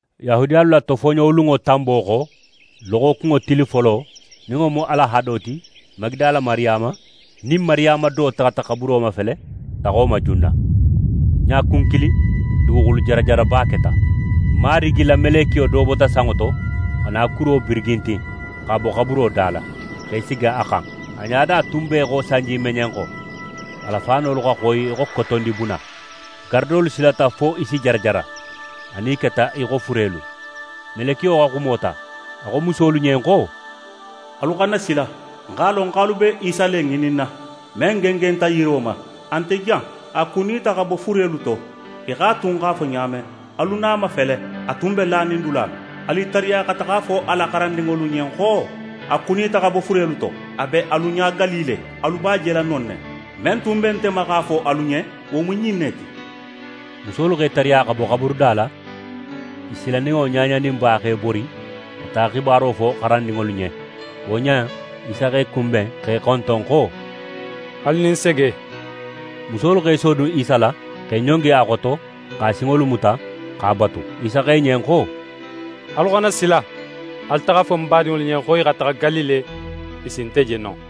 Yahudiyalu la tofoɲolunŋo tanbo xo, loxokunŋo tili folo, nin wo mu alahado ti, Magidala Mariyama nin Mariyama do taxata xaburo mafele saxo ma junna. Ɲakun kilin, duguxulu jarajaraba keta. Marigi la melekiyo do bota sanŋo to, xa na kuro birigintin, x'a bo xaburo da la, x'é sigi a xan. A ɲada tun be í xo sanjimeɲenxo, a la faanolu xa xoyi í xo kotondibuna. Garadolu silata fo i si jarajara, anin i keta í xo furelu. Melekiyo xa xumo ta. A xo musolu ɲen xo: «Alu xana sila! Ń x'a lon xo alu be Isa le ŋininna, men gengenta yiro ma. A nte jan, a kunita xa bo furelu to, í xo a tun x'a fo ɲa men. Alu na a mafele, a tun be lanin dula men! Alu i tariya xa taxa a fo a la xarandinŋolu ɲen xo: “A kunita xa bo furelu to, a be alu ɲa Galile, alu b'a jela non ne.” Men tun be nte ma x'a fo alu ɲen, wo mu ɲin ne ti.» Musolu x'e tariya xa bo xaburuda la. I silaninŋo ɲaɲaninba x'e bori xa taxa xibaro fo xarandinŋolu ɲen. Wo ɲa in, Isa x'e kunben, x'e xonton xo: «Alu nin sege.» Musolu x'e sodun Isa la, x'e ɲongi a xoto x'a sinŋolu muta x'a batu. Isa xo i ɲen xo: «Alu xana sila! Alu taxa a fo ń badinŋolu ɲen xo i xa taxa Galile, i si nte je non.»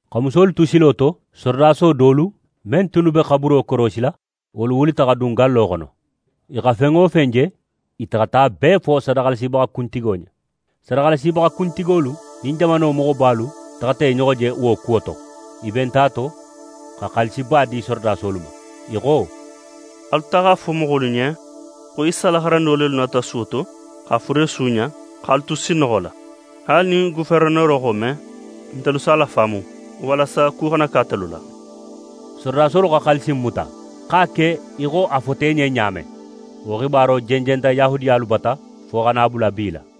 Xa musolu tu silo to, sorodaso dolu, men tunnu be xaburo korosila, wolu wulita xa dun gallo xono. I xa fen wo fen je, i taxata a bee fo sadaxalasibaxa kuntigolu ɲen. Sadaxalasibaxa kuntigolu nin jamano moxobalu taxata i ɲoxo je wo kuwo to. I benta a to xa xaalisiba di sorodasolu ma. I xo: «Alu taxa a fo moxolu ɲen xo Isa la xarandinŋo lelu nata suwo to x'a fure suuɲa, x'alu tu sinnoxo la. Haali nin goferenero xa wo me, ntelu si a lafaamu walasa ku xana ke atelu la.» Sorodasolu xa xaalisi in muta, x'a ke í xo a fota i ɲen ɲa men. Wo xibaro jenjenta Yahudiyalu bata fo xa na a bula bi la.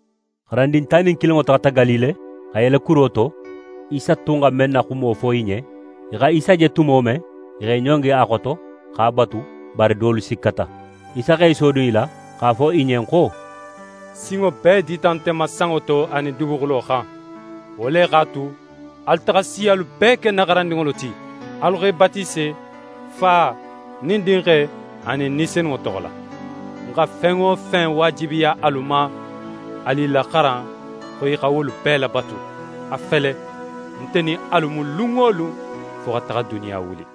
xarandin tan nin kilinŋo taxata Galile, xa yele kuro to, Isa tun xa men na xumo fo i ɲen. I xa Isa je tumo men, i x'e ɲongi a xoto, x'a batu, bari dolu sikkata. Isa x'é sodun i la x'a fo i ɲen xo: «Sinŋo bee dita nte ma sanŋo to anin duguxulo xan. Wo le x'a tu, alu taxa siyalu bee ke ń na xarandinŋolu ti, alu x'e batise Fa nin Dinxe anin Ni Senunŋo toxo la. Ń xa fen wo fen waajibiya alu ma, alu i laxaran xo i xa wolu bee labatu. A fele, nte nin alu mu lun wo lun, fo xa taxa duniya wuli.»